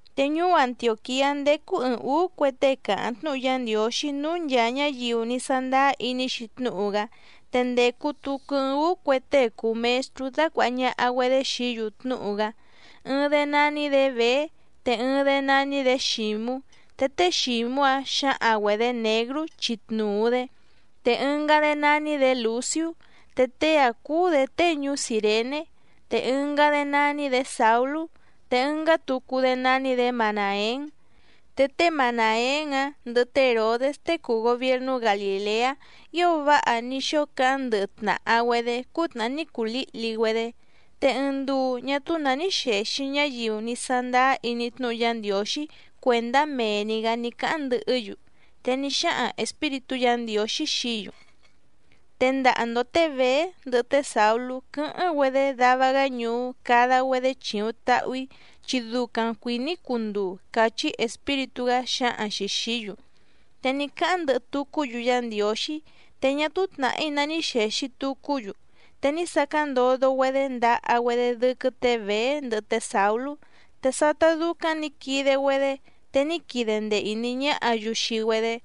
Te ñuú Antiòquiá ndécú ɨ̀ɨⁿ úú cue tée càháⁿ tnúhu Yá Ndiǒxí núú nchàa ñáyiu ní sándáá iní‑xi tnúhu‑gá. Te ndècu tucu ɨɨⁿ úú cue tée cùu mestrú dácuàha ñaha‑güedé xií‑yu tnúhu‑gá. Ɨɨⁿ‑dé nání‑dě Bèé, te ɨɨⁿ‑dé nání‑dě Xǐmú, te té Xǐmú‑áⁿ xǎhaⁿ‑güedě Něgrú chi tnuu‑dě. Te ɨngá‑dé nání‑dě Lùciú, te tée‑áⁿ cúú‑dě tée ñuú Cìrené. Te ɨngá‑dé nání‑dě Sàulú, te ɨngá tucu‑dé nání‑dě Manàén. Te té Manàén‑áⁿ ndɨhɨ té Hèrodés tée cùu gobiernú Galìleá ío váha ní xóo cáháⁿ ndɨhɨ tnàha‑güedé cútnàhá ní cuu lǐhli‑güedé. Te ɨɨⁿ nduu ñá túú nǎ ní xèxi ñáyiu ní sándáá iní tnúhu Yá Ndiǒxí cuèndá mee‑ni‑gǎ ní cáháⁿ ndɨhɨ́‑yu, te ní xáhaⁿ Espíritú Yǎ Ndiǒxí xií‑yu: —Tendaha‑ndo tě Bèé ndɨhɨ té Sàulú quɨ́hɨ́ⁿ‑güedé dava‑gá ñuú cada‑güedé chìuⁿ tahu‑í, chi ducaⁿ cuìní‑í cunduu —càchí Espíritú‑gá xǎhaⁿ‑xi xìí‑yu. Te ní cáháⁿ ndɨhɨ tucú‑yu Yá Ndiǒxí, te ñá túú tnàhí ná ní xèxi tucú‑yu, te ní sacáⁿ ndodo‑güedé ndaha‑güedé dɨ́quɨ́ tě Bèé ndɨhɨ té Sàulú. Te sátá dúcáⁿ nǐ quide‑güedé, te ní quide ndee ìní ñáhǎ‑yu xii‑güedé.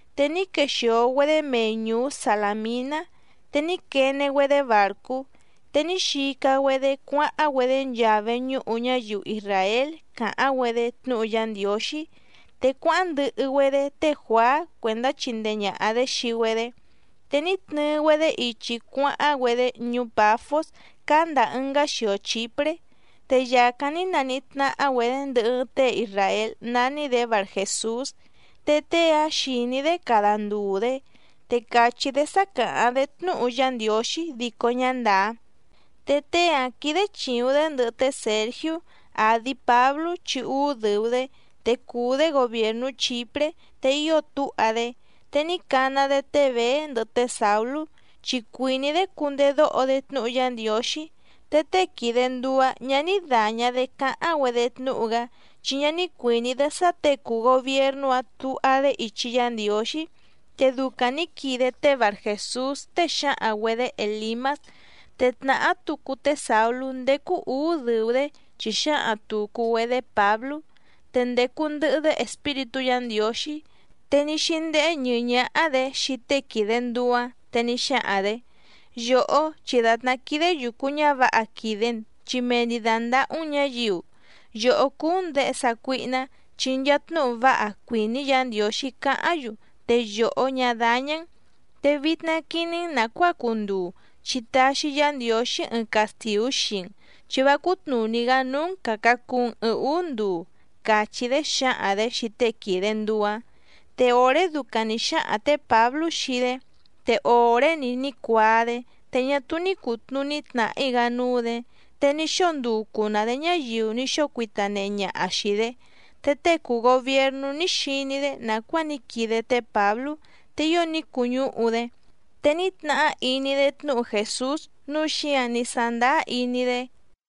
Te ní quexìo‑güedé mei ñùú Salàminá, te ní quene‑güedé bàrcú, te ní xica‑güedé cuáháⁿ‑güedé nchaa veñúhu ñáyiu isràél càháⁿ‑güedé tnúhu Yá Ndiǒxí. Te cuáháⁿ ndɨhɨ‑güedé té Juàá cuèndá chindee ñàha‑dé xii‑güedé. Te ní tnɨɨ‑güedé ichi cuáháⁿ‑güedé ñuú Pàfós cáá ndàa ɨngá xio Chìpré, te yàcáⁿ ní naníhí tnáhá‑güedě ndɨhɨ ɨɨⁿ tée isràél nání‑dě Barjèsús, te tée‑áⁿ xìní‑dé cada ndùu‑dé, te càchí‑dé sá càháⁿ‑dé tnúhu Yá Ndiǒxí dico ñá ndàá. Te tée‑áⁿ quídé chìuⁿ‑dé ndɨhɨ té Sèrgiú, àdi Páblú chi úú dɨ̀u‑dé, te cùu‑dé gobièrnú Chìpré, te ío túha‑dé. Te ní cana‑dé té Bèé ndɨhɨ té Sàulú, chi cuìní‑dé cundedóho‑dé tnúhu Yá Ndiǒxí. Te tée quìde nduu‑áⁿ ñǎ ní dàña‑dé cáháⁿ‑güedé tnúhu‑gá, chi ñá ní cuìní‑dé sá těe cùu gobiernú‑áⁿ tuha‑dé ichi Yá Ndiǒxí. Te ducaⁿ nǐ quide té Barjèsús, tée xǎhaⁿ‑güedě Èlimás. Te tnàhá tucu té Sàulú ndécú ǔú dɨ̀u‑dé chi xǎhaⁿ tùcu‑güedé Pǎblú, te ndècu ndɨhɨ‑dé Espíritú Yǎ Ndiǒxí. Te ní xíndéhé ñɨ̀ɨ́ ñáhá‑dě xii tée quìde nduu‑áⁿ. Te ní xáhaⁿ‑dě: —Yòhó, chi dàtná quídé yùcu ñávǎha quìde‑n chi mee‑ni dàndahú‑n ñǎyiu. Yòhó cúú‑n děhe sácuíhná, chi nchaa tnúhu váha cuìní Yǎ Ndiǒxí cáháⁿ‑yu, te yòhó ñá dáñá‑n. Te vitna quiní‑n nàcuáa cunduu, chi taxi Yá Ndiǒxí ɨɨⁿ castìú xii‑n chi vá cútnùní‑gá núú‑n càca cuu‑n ɨɨⁿ úú nduu —càchí‑dé xǎhaⁿ‑dě xii tée quìde nduu‑áⁿ. Te òré ducaⁿ nǐ xáhaⁿ tě Pǎblú xii‑dé, te òré‑ni ní cuaa‑dé, te ñá túú ní cùtnuní tnàhí‑gá núú‑dě, te ní xóo nducu‑nǎ‑dé ñáyiu ní xóo cuita nehe ñaha xìi‑dé. Te tée cùu gobiernú ní xiní‑dé nàcuáa ní quide té Pǎblú, te ío ní cuñúhu‑dé. Te ní tnahá iní‑dé tnúhu Jèsús, núu xíǎⁿ ní sándáá iní‑dé.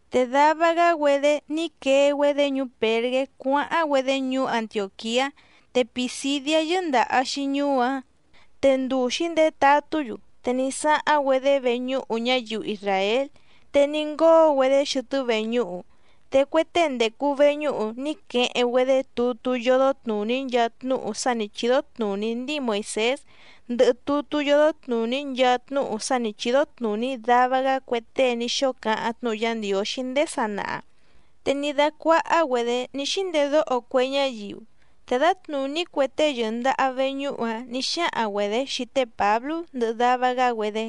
Te dava‑gá‑güedé ní quee‑güedé ñuú Pèrgé cuáháⁿ‑güedé ñuú Antiòquiá, te Pìsidiá yɨ́ndàha‑xi ñuú‑áⁿ. Te nduu xǐndetatú‑yu, te ní sáháⁿ‑güedé veñúhu ñáyiu isràél, te ní ngóo‑güedé xɨtɨ́ veñúhu. Te cue tée ndècu veñúhu ní queheⁿ‑güedé tutú yódó tnùní nchaa tnúhu sá nǐ chídó tnùní ndíi Moìsés ndɨhɨ tutú yódó tnùní nchaa tnúhu sá nǐ chídó tnùní dava‑gá cue tée ní xóo cáháⁿ tnúhu Yá Ndiǒxí ndéé sanaha, te ní dácuáhá‑güedě ní xíndedóho cue ñáyiu, te dǎtnùní cue tée yɨ̀ndaha veñúhu‑áⁿ nǐ xáhaⁿ‑güedě xii té Pǎblú ndɨhɨ dava‑gá‑güedé: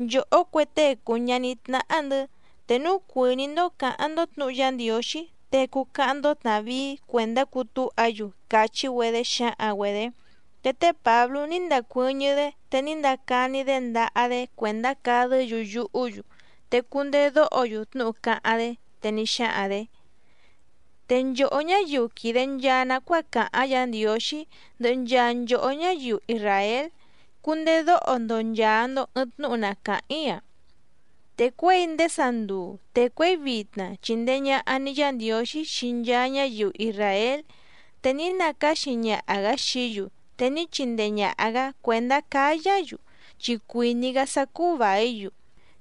—Nchòhó cue tée cùu ñaní tnáhá‑ndɨ̌, te núu cuìní‑ndó cǎháⁿ‑ndó tnǔhu Yá Ndiǒxí, te cuu cáháⁿ‑ndó tnàvíí cuèndá cutúha‑yu —càchí‑güedé xǎhaⁿ‑güedě. Te té Pǎblú ní ndacuɨ́ñɨ́‑dé, te ní ndacani‑dé ndaha‑dé cuèndá cadɨ́‑yu yuhú‑yu te cundedóho‑yu tnúhu cáháⁿ‑dé, te ní xáhaⁿ‑dě: —Te nchòhó ñáyiu quìde nchaa nacuáa càháⁿ Yǎ Ndiǒxí ndɨhɨ nchaa nchòhó ñáyiu isràél, cundedóho‑ndo nchàa‑ndo ɨɨⁿ tnúhu na càháⁿ‑í‑a. Te cuěi ndéé sanduu te cuěi vitna chìndee ñaha‑ni Yá Ndiǒxí xii nchaa ñáyiu isràél, te ní nacáxi ñaha‑gǎ xií‑yu te ní chindee ñàha‑gá cuèndá cáyá‑yu, chi cuìní‑gá sá cúú vàí‑yu,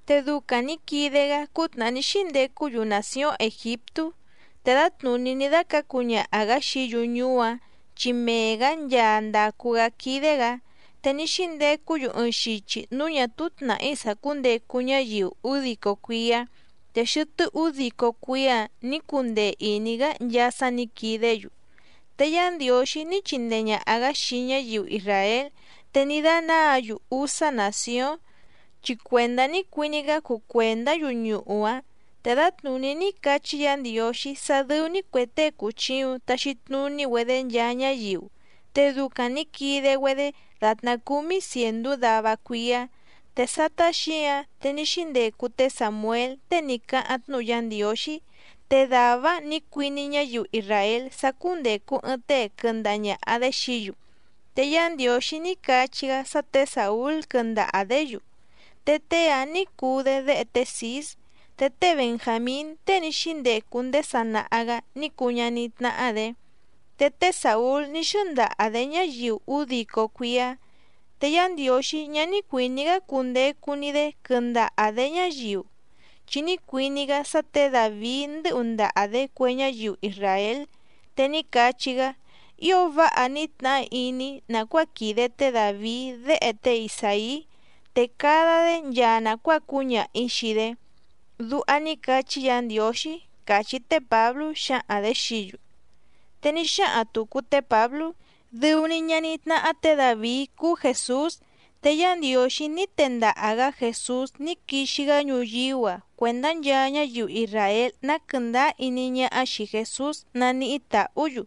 te ducaⁿ nǐ quide‑gá cútnàhá ní xíndecú‑yu nàcióⁿ Ègiptú. Te dǎtnùní ní dácǎcu ñaha‑gǎ xií‑yu ñuú‑áⁿ, chi mee‑gǎ nchaa ndàcu‑gá quídé‑gǎ. Te ní xíndecú‑yu ɨɨⁿ xichi núú ñà túú tnàhí sàcúndecu ñáyiu údico cuíá, te xɨtɨ́ údico cuíá‑ǎⁿ nǐ cundee ìní‑gá nchaa sá nǐ quidé‑yu. Te Yá Ndiǒxí ní chindee ñàha‑gá xii ñáyiu isràél, te ní dánáǎ‑yu úsá nàcióⁿ, chi cuèndá ní cuiní‑gá cuu cuèndá‑yu ñuhú‑áⁿ. Te dǎtnùní ní cachí Yǎ Ndiǒxí sá dɨ́ú‑ní cuè tée cùchiuⁿ taxi tnuní‑güedé nchaa ñáyiu, te ducaⁿ nǐ quide‑güedé dàtná cúmí cièndú dava cuíá. Te sátá xǐǎⁿ, te ní xíndecu té Sàmuél tée ní cáháⁿ tnúhu Yá Ndiǒxí. Te dàvá‑áⁿ nǐ cuiní ñáyiu isràél sá cúndècu ɨɨⁿ tée quɨndaha ñàha‑dé xií‑yu, te Yá Ndiǒxí ní cachí‑gá sá tě Sàúl quɨndaha‑dě‑yu, te tée‑áⁿ nǐ cuu‑dé déhe té Cǐs, te té Benjàmín tée ní xíndecu ndéé sanaha‑gǎ ní cuu ñaní tnáhá‑dě. Te té Sàúl ní xɨ́ndaha‑dě ñáyiu údico cuíá. Te Yá Ndiǒxí ñá ní cuìní‑gá cundecu‑ni‑dé quɨndaha‑dě ñáyiu, chi ní cuiní‑gá sá tě Dàvií ndɨ́hu ndaha‑dě cue ñáyiu isràél, te ní cachí‑gá: “Ío váha ní tnahá iní‑í nàcuáa quìde té Dàvií déhe tée Isàí, te cada‑dé nchaa nàcuáa cúñaha‑ǐ xii‑dé”, duha ní cachí Yǎ Ndiǒxí —càchí té Pǎblú xǎhaⁿ‑dě xií‑yu. Te ní xáhaⁿ tùcu té Pǎblú: —Dɨu‑ni ñaní tnáhá tě Dàvií cúú Jèsús. Te Yá Ndiǒxí ní tendaha‑gǎ Jèsús ní quixi‑gá ñuyíú‑a cuèndá nchaa ñáyiu isràél ná quɨ̀ndáá iní ñáhá xìi Jesús naníhí tàhú‑yu,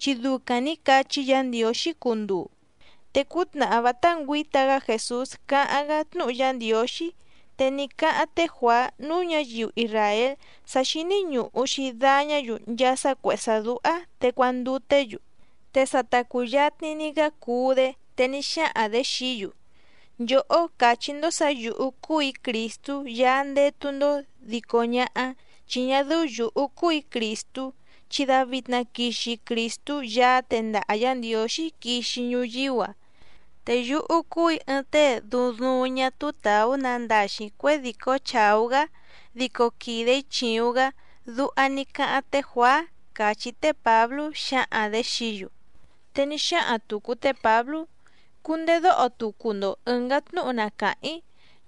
chi ducaⁿ nǐ cachí Yǎ Ndiǒxí cunduu. Te cútnàhá vátá ngüǐta‑gá Jèsús cáháⁿ‑gá tnúhu Yá Ndiǒxí, te ní cáháⁿ té Juàá núú ñǎyiu isràél sá xíní ñùhu‑xi dañá‑yu nchaa sá cuèhé sá dúhá, te cuanduté‑yu. Te sa ta cùyatni‑ni‑gá cuú‑dé, te ní xáhaⁿ‑dě xií‑yu: “Nchòhó càchí‑ndó sǎ yǔhú cúù‑í Crìstú Yaá ndétú‑ndó dico ñáhá, chi ñá dɨ́ú yǔhú cúù‑í Crìstú, chi davitna quixi Crìstú Yaá tendaha Yǎ Ndiǒxí quixi ñuyíú‑a. Te yúhú cúù‑í ɨɨⁿ tée duuⁿ duuⁿ ñá túú tàú nandaxi cuědìcó chàú‑gá dico quìde‑í chìuⁿ‑gá”, duha ní cáháⁿ te Juàá —càchí té Pǎblú xǎhaⁿ‑dě xií‑yu. Te ní xáhaⁿ tùcu té Pǎblú: —Cundedóho tucu‑ndo ɨ̀ngá tnúhu na càháⁿ‑í.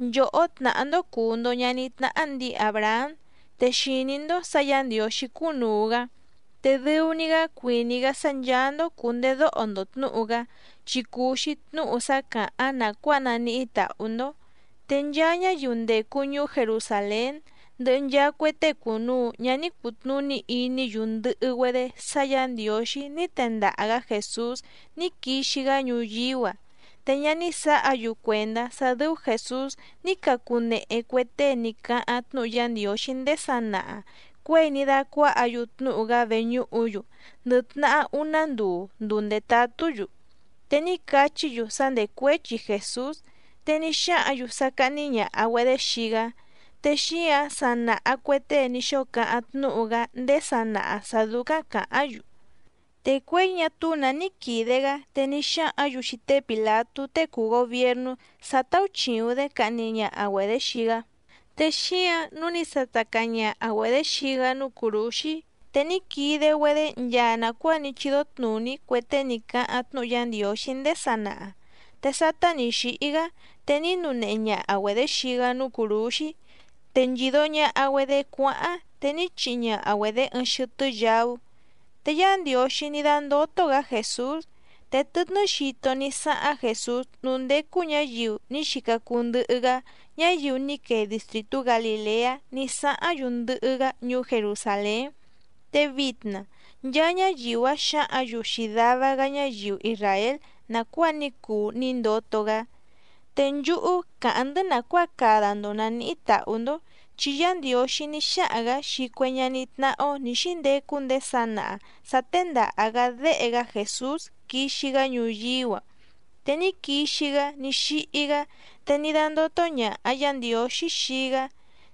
Nchòhó tnàhá‑ndó cùu‑ndo ñaní tnáhá ndǐi Àbrahám, te xìní‑ndó sǎ Yǎ Ndiǒxí cúnùu‑gá. Te dɨu‑ni‑gá cuìní‑gá sá ncháá‑ndó cùndedóho‑ndo tnǔhu‑gá, chi cùu‑xi tnúhu sá càháⁿ nàcuáa naníhí tàhú‑ndó. Te nchaa ñáyiu ndècu ñuú Jerusàlén ndɨhɨ nchaa cue tée cùnuu ñá ní cùtnuní iní‑yu ndɨhɨ‑güedé sá Yǎ Ndiǒxí ní tendaha‑gǎ Jèsús ní quixi‑gá ñuyíú‑a. Te ñá ní sǎha‑yu cuèndá sá dɨ́ú Jèsús ní cacunehe cue tée ní cáháⁿ tnúhu Yá Ndiǒxí ndéé sanaha cuěi ní dácuáhǎ‑yu tnúhu‑gá veñúhu‑yu ndɨ tnahá úná nduu, nduu ndètatú‑yu. Te ní cachí‑yu sá ndècuéchi Jèsús, te ní xáhǎⁿ‑yu sá cáhní ñàha‑güedé xii‑gá. Te xíǎⁿ sa nàha cue tée ní xóo cáháⁿ tnúhu‑gá ndéé sanaha sǎ dúcáⁿ càháⁿ‑yu. Te cuěi ñá túú nǎ ní quìde‑gá te ní xáhǎⁿ‑yu xii té Pìlatú tée cùu gobiernú sá táúchìuⁿ‑dé cahni ñaha‑güedě xii‑gá. Te xíǎⁿ nǔu ní sata caa ñaha‑güedě xii‑gá núú cùrúxí. Te ní quide‑güedé nchaa nàcuáa ní chídó tnùní cue tée ní cáháⁿ tnúhu Yá Ndiǒxí ndéé sanaha. Te sátá nì xíhí‑gá, te ní nunehe ñaha‑güedě xii‑gá núú cùrúxí, te nchìdo ñaha‑güedé cuáháⁿ, te ní chihi ñaha‑güedě ɨɨⁿ xɨtɨ́ yaú. Te Yá Ndiǒxí ní dándótó‑gǎ Jèsús. Te tɨtnɨ́ xito ní sáháⁿ Jèsús núú ndécú ñǎyiu ní xica cuu ndɨhɨ‑gá, ñáyiu ní quee distrìtú Galìleá ní sáháⁿ‑yu ndɨhɨ‑gá ñuú Jerusàlén. Te vitna nchaa ñáyiu‑áⁿ xǎhǎⁿ‑yu xii dava‑gá ñáyiu isràél nàcuáa ní cuu ní ndoto‑gá. ’Te nchúhú càháⁿ‑ndɨ́ nàcuáa cada‑ndo nàníhí tàhú‑ndó, chi Yá Ndiǒxí ní xáhaⁿ‑gǎ xii cue ñaní tnáhá‑ó nǐ xíndecu ndéé sanaha sǎ téndàha‑gá Déhe‑gá Jèsús quixi‑gá ñuyíú‑a. Te ní quixi‑gá ní xíhí‑gá, te ní dándótó ñàha Yá Ndiǒxí xii‑gá,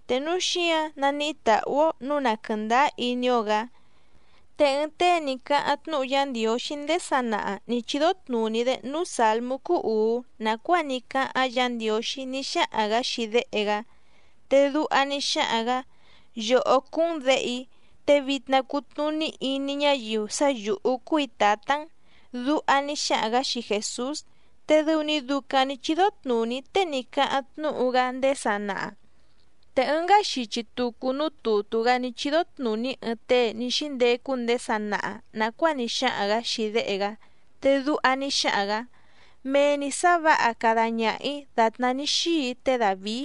te núu xíǎⁿ naníhí tàhú‑ó nǔu na quɨ̀ndáá iní‑ó‑gǎ. Te ɨɨⁿ tée ní cáháⁿ tnúhu Yá Ndiǒxí ndéé sanaha nǐ chídó tnùní‑dé núú sàlmú cúú ùú nàcuáa ní cáháⁿ Yǎ Ndiǒxí ní xáhaⁿ‑gǎ xii Déhe‑gá, te duha ní xáhaⁿ‑gǎ: “Yòhó cúú‑n Děhe‑í, te vitna cutnùní iní ñáyiu sá yǔhú cúù‑í Tǎtá‑n”, duha ní xáhaⁿ‑gǎ xii Jèsús. Te dɨu‑ni ducaⁿ nǐ chídó tnùní tée ní cáháⁿ tnúhu‑gá ndéé sanaha. Te ɨngá xichi tucu núú tùtú‑gá ní chídó tnùní ɨɨⁿ tée ní xíndecu ndéé sanaha nàcuáa ní xáhaⁿ‑gǎ xii Déhe‑gá, te duha ní xáhaⁿ‑gǎ: “Mee‑ni sǎ vǎha cada ñaha‑ǐ dàtná ní xíi‑í té Dàvií”,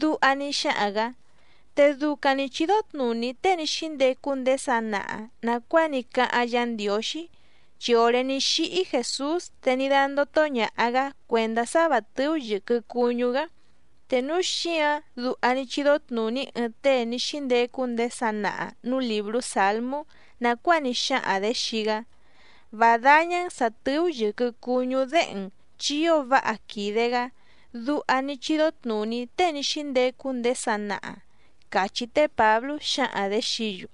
duha ní xáhaⁿ‑gǎ. Te ducaⁿ nǐ chídó tnùní tée ní xíndecu ndéé sanaha nàcuáa ní cáháⁿ Yǎ Ndiǒxí, chi òré ní xíhí Jèsús te ní dándótó ñàha‑gá cuèndá sá vǎ tɨ́ú yɨ̀quɨ cuñú‑gá. Te núu xíǎⁿ duha ní chídó tnùní ɨɨⁿ tée ní xíndecu ndéé sanaha nǔú lìbrú Sǎlmú nàcuáa ní xáhaⁿ‑dě xii‑gá: “Vá dáñá‑n sǎ tɨ́ú yɨ̀quɨ cuñú Déhe‑n chi ío váha quìde‑gá”, duha ní chídó tnùní tée ní xíndecu ndéé sanaha —càchí té Pǎblú xǎhaⁿ‑dě xií‑yu.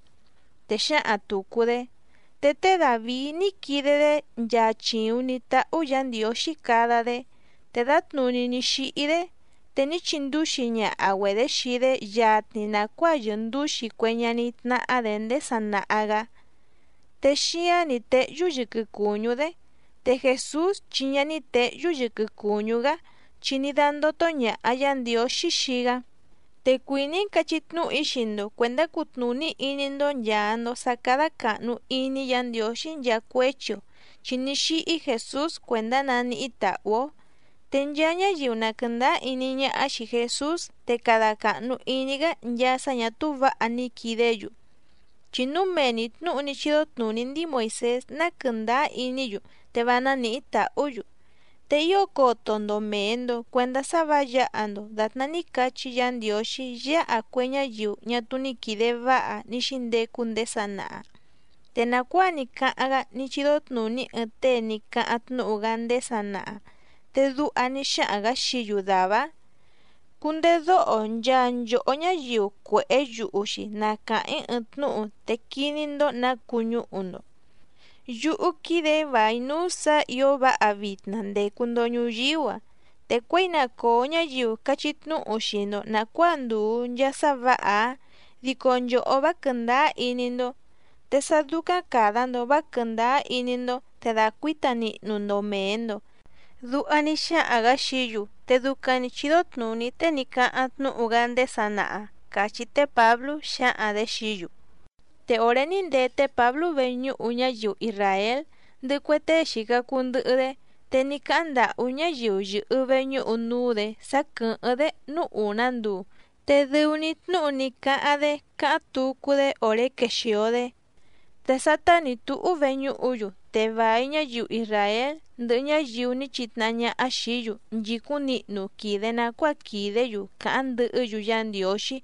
Te xǎhaⁿ tùcu‑dé: —Te té Dàvií ní quide‑dé nchaa chìuⁿ ní táhú Yǎ Ndiǒxí cada‑dé, te dǎtnùní ní xíhí‑dé. Te ní chindúxi ñaha‑güedě xii‑dé yatni nàcuáa yɨ̀ndúxi cue ñaní tnáhá‑dě ndéé sanaha‑gǎ, te xíáⁿ nǐ téhyú yɨquɨ cùñú‑dé. Te Jèsús chi ñá ní těhyú yɨquɨ cùñú‑gá, chi ní dándótó ñàha Yá Ndiǒxí xii‑gá. Te cuìní‑í cachí tnúhu‑í xii‑ndo cuèndá cutnùní iní‑ndó nchàa‑ndo sá cádá càhnu iní Yǎ Ndiǒxí nchaa cuéchi‑o, chi ní xíhí Jèsús cuèndá naníhí tàhú‑ó. Te nchaa ñáyiu na quɨ̀ndáá iní ñáhá xìi Jesús te cada càhnu iní‑gá nchaa sá ñà túú vǎha ní quidé‑yu, chi núu mee‑ni tnǔhu ní chídó tnùní ndíi Moìsés ná quɨ̀ndáá iní‑yu te vá nánìhí tàhú‑yu. Te ío coto‑ndo mèe‑ndo cuendá sá vǎ yǎha‑ndo dàtná ní cachí Yǎ Ndiǒxí yáha cue ñáyiu ñá túú ní quìde váha ní xíndecu ndéé sanaha. Te nàcuáa ní cáháⁿ‑gá ní chídó tnùní ɨɨⁿ tée ní cáháⁿ tnúhu‑gá ndéé sanaha, te duha ní xáhaⁿ‑gǎ xií‑yu dàvá‑áⁿ: Cundedóho nchaa nchòhó ñáyiu cuèhé yuhu‑xi na càháⁿ‑í ɨɨⁿ tnúhu te quiní‑ndó nǎ cuñúhu‑ndo, yúhú quídè‑í vài núú sǎ ǐo váha vitna ndècu‑ndo ñuyíú‑a, te cuěi na còo ñáyiu cachí tnúhu xii‑ndo nàcuáa ndùu nchaa sá vǎha‑áⁿ, dico nchòhó vá quɨ̀ndáá iní‑ndó, te sá dúcáⁿ càda‑ndo vá quɨ̀ndáá iní‑ndó, te dàcuíta nihnu‑ndo mèe‑ndo. Duha ní xáhaⁿ‑gǎ xií‑yu te ducaⁿ nǐ chídó tnùní tée ní cáháⁿ tnúhu‑gá ndéé sanaha —càchí té Pǎblú xǎhaⁿ‑dě xií‑yu. Te òré ní ndee té Pǎblú veñúhu ñáyiu isràél ndɨhɨ cue tée xìca cuu ndɨhɨ‑dé, te ní cáháⁿ ndàhú ñáyiu yɨ̀hɨ veñúhu núú‑dě sá quɨ̀hɨ́ⁿ‑dé núú ùná nduu, te dɨu‑ni tnúhu ní cáháⁿ‑dé cáháⁿ tucu‑dé òré quexìo‑dé. Te sátá nǐ túhú veñúhu‑yu, te vài ñáyiu isràél ndɨhɨ ñáyiu ní chitnahá ñáhá xìí‑yu nchìcúⁿ nihnu quìde nacuáa quìdé‑yu càháⁿ ndɨhɨ́‑yu Yá Ndiǒxí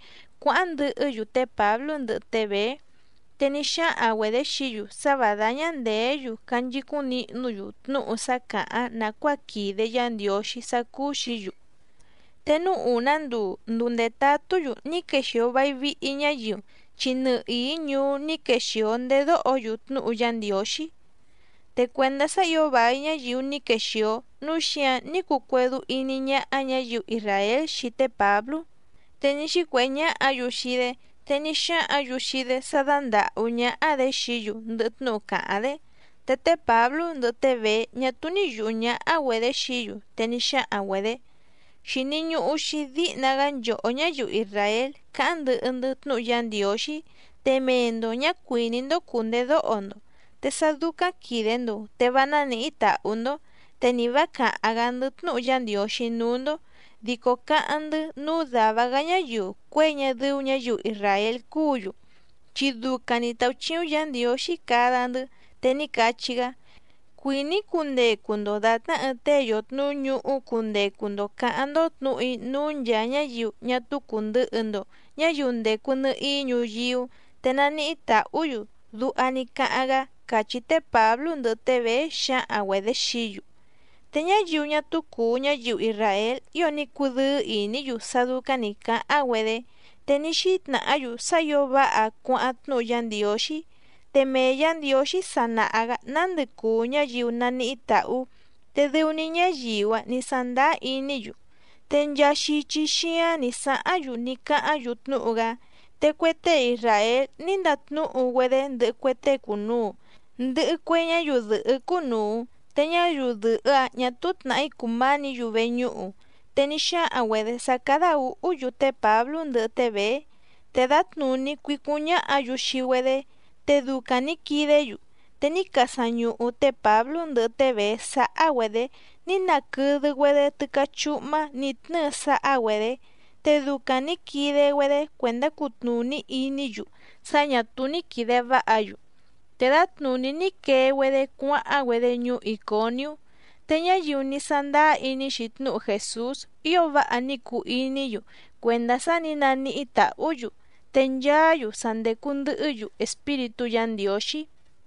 cuáháⁿ ndɨhɨ́‑yu té Pǎblú ndɨhɨ té Bèé. Te ní xáhaⁿ‑güedě xií‑yu sá vǎ dáñá ndèé‑yu canchicúⁿ nihnú‑yu tnúhu sá càháⁿ nàcuáa quìde Yá Ndiǒxí sá cúú‑xǐ‑yu. Te núú ùná nduu, nduu ndètatú‑yu ní quexìo vai vihi ñáyiu, chi nɨhìí ñuú ní quexìo ndedóho‑yu tnúhu Yá Ndiǒxí. Te cuèndá sá ǐo vài ñáyiu ní quexìo, núu xíǎⁿ ní cuu cuédú íní ñáhá ñǎyiu isràél xii té Pǎblú, te ní xícuèhé ñáhǎ‑yu xii‑dé. Te ní xáhǎⁿ‑yu xii‑dé sá dándàhú ñáhá‑dě xií‑yu ndɨhɨ tnúhu càháⁿ‑dé. Te té Pǎblú ndɨhɨ té Bèé ñá túú ní yùhú ñáhá‑güedě xií‑yu. Te ní xáhaⁿ‑güedě: —Xìni ñuhu‑xi díhna‑gá nchòhó ñáyiu isràél cáháⁿ ndɨhɨ‑ndɨ́ tnúhu Yá Ndiǒxí, te mee‑ndo ñǎ cuìní‑ndó cùndedóho‑ndo. Te sá dúcáⁿ quìde‑ndo, te vá nánìhí tàhú‑ndó, te ni vǎ càháⁿ‑gá‑ndɨ́ tnúhu Yá Ndiǒxí núú‑ndó, dico cáháⁿ‑ndɨ́ núú dàva‑gá ñáyiu cuěi ñá dɨ́ú ñǎyiu isràél cúǔ‑yu, chi ducaⁿ nǐ táúchíúⁿ Yǎ Ndiǒxí cada‑ndɨ́. Te ní cachí‑gá: Cuìní‑í cundecu‑ndo dàtná ɨɨⁿ tée yòtnuú ñuhú cundecu‑ndo cǎháⁿ‑ndó tnǔhu‑í núú nchàa ñáyiu ñá túú cùndɨhɨ‑ndo ñáyiu ndècu nɨhií ñuyíú, te naníhí tàhú‑yu, duha ní cáháⁿ‑gá —càchí té Pǎblú ndɨhɨ té Bèé xǎhaⁿ‑güedě xií‑yu. Te ñáyiu ñá túú cùu ñáyiu isràél ío ní cudɨ́ɨ́ ìní‑yu sá dúcáⁿ nǐ cáháⁿ‑güedé, te ní xítnàhá‑yu sá ǐo váha cuáháⁿ tnúhu Yá Ndiǒxí. Te mee Yǎ Ndiǒxí sa nàha‑gá nándɨ cùu ñáyiu naníhí tàhú, te dɨu‑ni ñáyiu‑áⁿ nǐ sándáá iní‑yu. Te nchaa xichi xíáⁿ nǐ sáháⁿ‑yu ní cáháⁿ‑yu tnúhu‑gá. Te cue tée isràél ní ndatnúhu‑güedé ndɨhɨ cue tée cùnuu, ndɨhɨ cue ñáyiu dɨ̀hɨ́ cúnùu, te ñáyiu dɨ̀hɨ́‑áⁿ ñà túú tnàhí cùmánǐ‑yu veñúhu. Te ní xáhaⁿ‑güedě sá cádá ǔhú‑yu té Pǎblú ndɨhɨ té Bèé, te dǎtnùní cuícúⁿ ñáhǎ‑yu xii‑güedé, te ducaⁿ nǐ quidé‑yu. Te ní casaⁿ ñuhu té Pǎblú ndɨhɨ té Bèé sáhá‑güedě ní naquɨdɨ‑güedé tɨ́cá chúhmá nǐ tnɨ́ɨ sáhá‑güedě. Te ducaⁿ nǐ quide‑güedé cuèndá cutnùní iní‑yu sá ñà túú ní quìde váha‑yu. Te dǎtnùní ní quee‑güedé cuáháⁿ‑güedé ñuú Ìconiú. Te ñáyiu ní sándáá iní‑xi tnúhu Jèsús ío váha ní cuu iní‑yu cuèndá sá nǐ naníhí tàhú‑yu, te nchaá‑yu sa ndècu ndɨhɨ́‑yu Espíritú Yǎ Ndiǒxí.